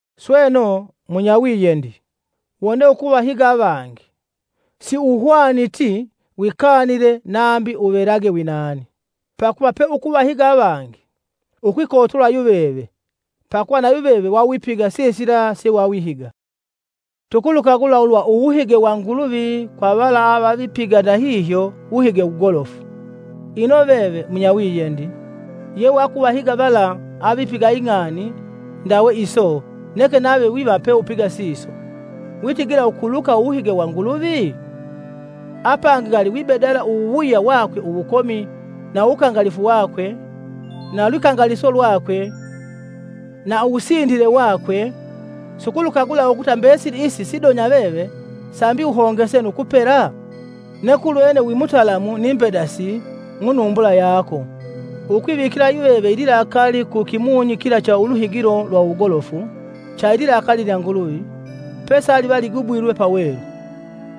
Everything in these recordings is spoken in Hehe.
Sweno, munyawiyendi, wone ukuvahiga avangi, siuhwaniti wikanile nambi uvelage winani. Pakuva pe ukuvahiga avangi, ukwikotola yuveve pakuva nayuveve wawipiga sisila sewawihiga. Tukulukagula ulwa uwuhige wa Nguluvi kwa vala avavipiga ndahihyo wuhige wugolofu. Ino veve, munyawiyendi, yewakuvahiga vala avipiga ing'ani ndawe iso neke nave viva peupiga siso, witigila ukuluka uwuhige wa Nguluvi? Apangi ngali wibedala uwuwuya wakwe uwukomi, na uwukangalifu wakwe, na lwikangaliso lwakwe na uwunsindile wakwe sukulukagula ukuta mbesili isi sidonya veve sambi uhongese nu kupela? Neke ulwene wi mutalamu ni mbedasi mu numbula yako ukwivikila yuveve ililakali ku kimunyi kila cha uluhigilo lwa uwugolofu cha ililakali lya Nguluvi pesaliva ligubwilwe pawelu.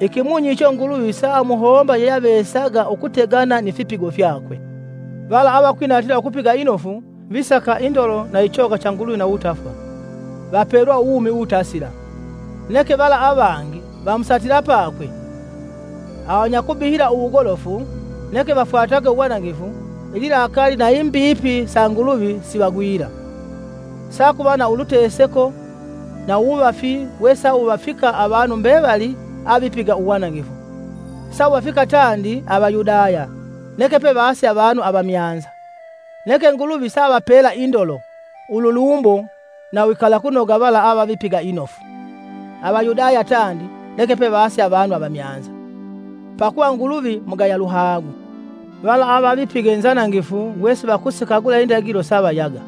Ikimunyi icho Nguluvi saamuhomba yeyeavesaga ukutegana nifipigo fyakwe. Vala avakwinatila ukupiga inofu, visaka indolo na ichoga cha Nguluvi na uwutafwa, vapelwa uwumi uwutasila. Neke vala avangi vamusatila pakwe, avanyakubihila uwugolofu neke vafwatage uwanangifu, ililakali na imbipi sa Nguluvi sivagwila. Sakuva na uluteseko na uwuvafi wesa wuvafika avanu mbevali avipiga uwanangifu. Sawuvafika tandi Avayudaya neke pevase avanu avamyanza. Neke Nguluvi saavapela Indolo, ululumbo na uwikalakunoga vala avavipiga inofu; Avayudaya tandi neke pevase avanu avamyanza. Pakuva Nguluvi mugaya luhagu. Vala avavipiga inzanangifu wesivakusikagula indagilo savayaga.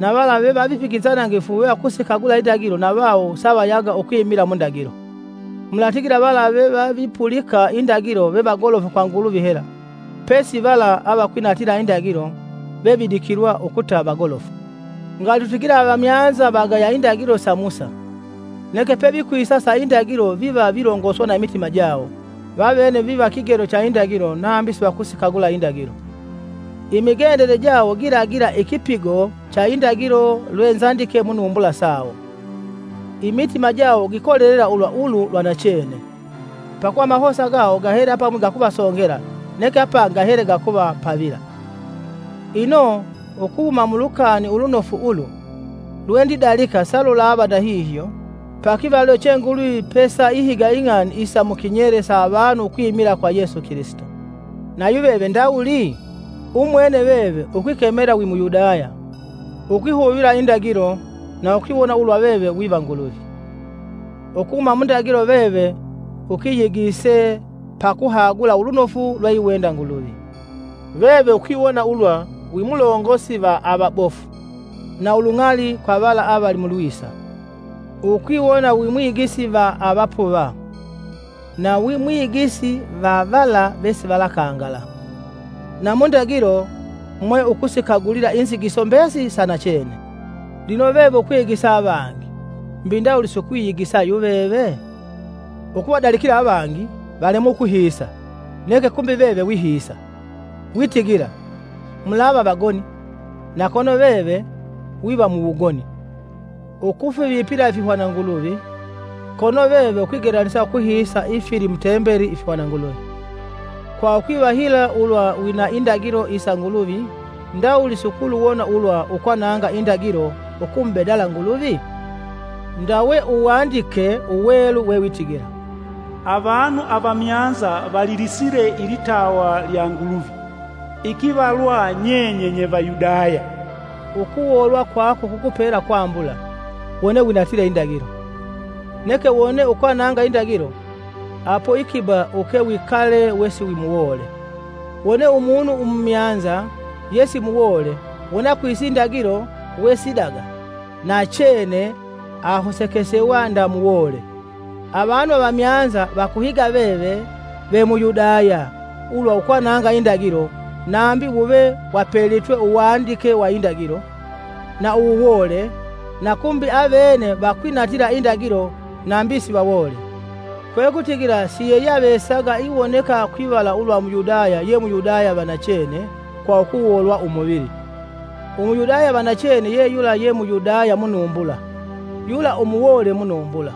Na vala vevavipiga inzanangifu wevakusikagula indagilo na vawo savayaga ukwimila mundagilo. Mulatigila vala vevavipulika indagilo vevagolofu kwa Nguluvi hela pesi vala avakwinatila indagilo vevidikilwa ukuta vagolofu. Ngali tutigile avamyanza vagaya indagilo sa Musa; neke pevikwisa sa indagilo viva vilongoswa na imitima jawo, vavene viva kigelo cha indagilo nave sivakusikagula indagilo. Imigendele jawo gilagila ikipigo cha indagilo lwe nzandike munumbula sawo. Imitima jawo gikolelela ulwa ulu lwa nachene, pakuva amahosa gawo gahele apamwi gakuvasongela neke apangi gahele gakuvapavila. Ino ukuhuma mu Lukani Ulunofu ulu, lwendidalika salulava ndahihyo pakivalilo che Nguluvi pesaihiga ing'ani isa mukinyele sa avanu ukwimila kwa Yesu Kilisito. Na yuveve ndawuli? Umwene veve ukwikemela wi Muyudaya; ukwihuvila indagilo na ukwiwona ulwa veve wiva Nguluvi; Ukuhuma mundagilo veve ukiyigise pakuhagula ulunofu lweiwenda Nguluvi, veve ukwiwona ulwa wimulongosi va avabofu, na ulung'ali kwa vala avali mu lwisa. Ukwiwona wimwigisi va avapuva na wimwigisi va vala vesivalakangala. Na mu ndagilo, mwe ukusikagulila inzigiso mbesili sa nachene. Lino veve ukwigisa avangi; mbi ndawuli si ukwiyigisa yu veve? Ukuvadalikila avangi valemwe ukuhiisa neke kumbi veve wihiisa. Witigila: “Mulava vagoni,” na kono veve wiva muwugoni, ukufivipila ifihwananguluvi kono veve ukwigelanisa ukuhiisa ifili mutembeli ifihwananguluvi. Kwa ukwivahila ulwa wina indagilo isa Nguluvi ndawuli siukuluwona ulwa ukwananga indagilo ukumubedala Nguluvi? Ndawe Uwandike Uwelu wewitigila, “Avanu avamyanza valilisile ilitawa lya Nguluvi ikivalwa nyenye nye Vayudaya!” Ukuwoolwa kwako kukupela kwambula, wone winatile indagilo. Neke wone ukwananga indagilo, apo ikiba ukewikale wesiwimuwoole. Wone umunu umumyanza yesimuwoole wone akwise indagilo we sidaga, nachene ahosekesewa nda muwoole. Avanu avamyanza vakuhiga veve ve Muyudaya ulwa ukwananga indagilo nambi wuve wapelitwe Uwandike wa indagilo, na uwuwoole, na kumbi avene vakwinatila indagilo nambi sivawoole. Kwekutigila siyeyeavesaga iwoneka kwivala ulwa Muyudaya ye Muyudaya vanachene kwa ukuwoolwa umuvili. Umuyudaya vanachene ye yula ye Muyudaya munumbula, yula umuwoole munumbula.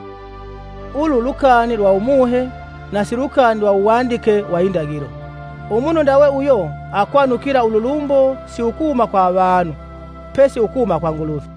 Ulu lukani lwa Umuhe na silukani lwa Uwandike wa Indagilo. Umunu ndawe uyo akwanukila ululumbo si ukuhuma kwa avanu, pesi ukuhuma kwa Nguluvi.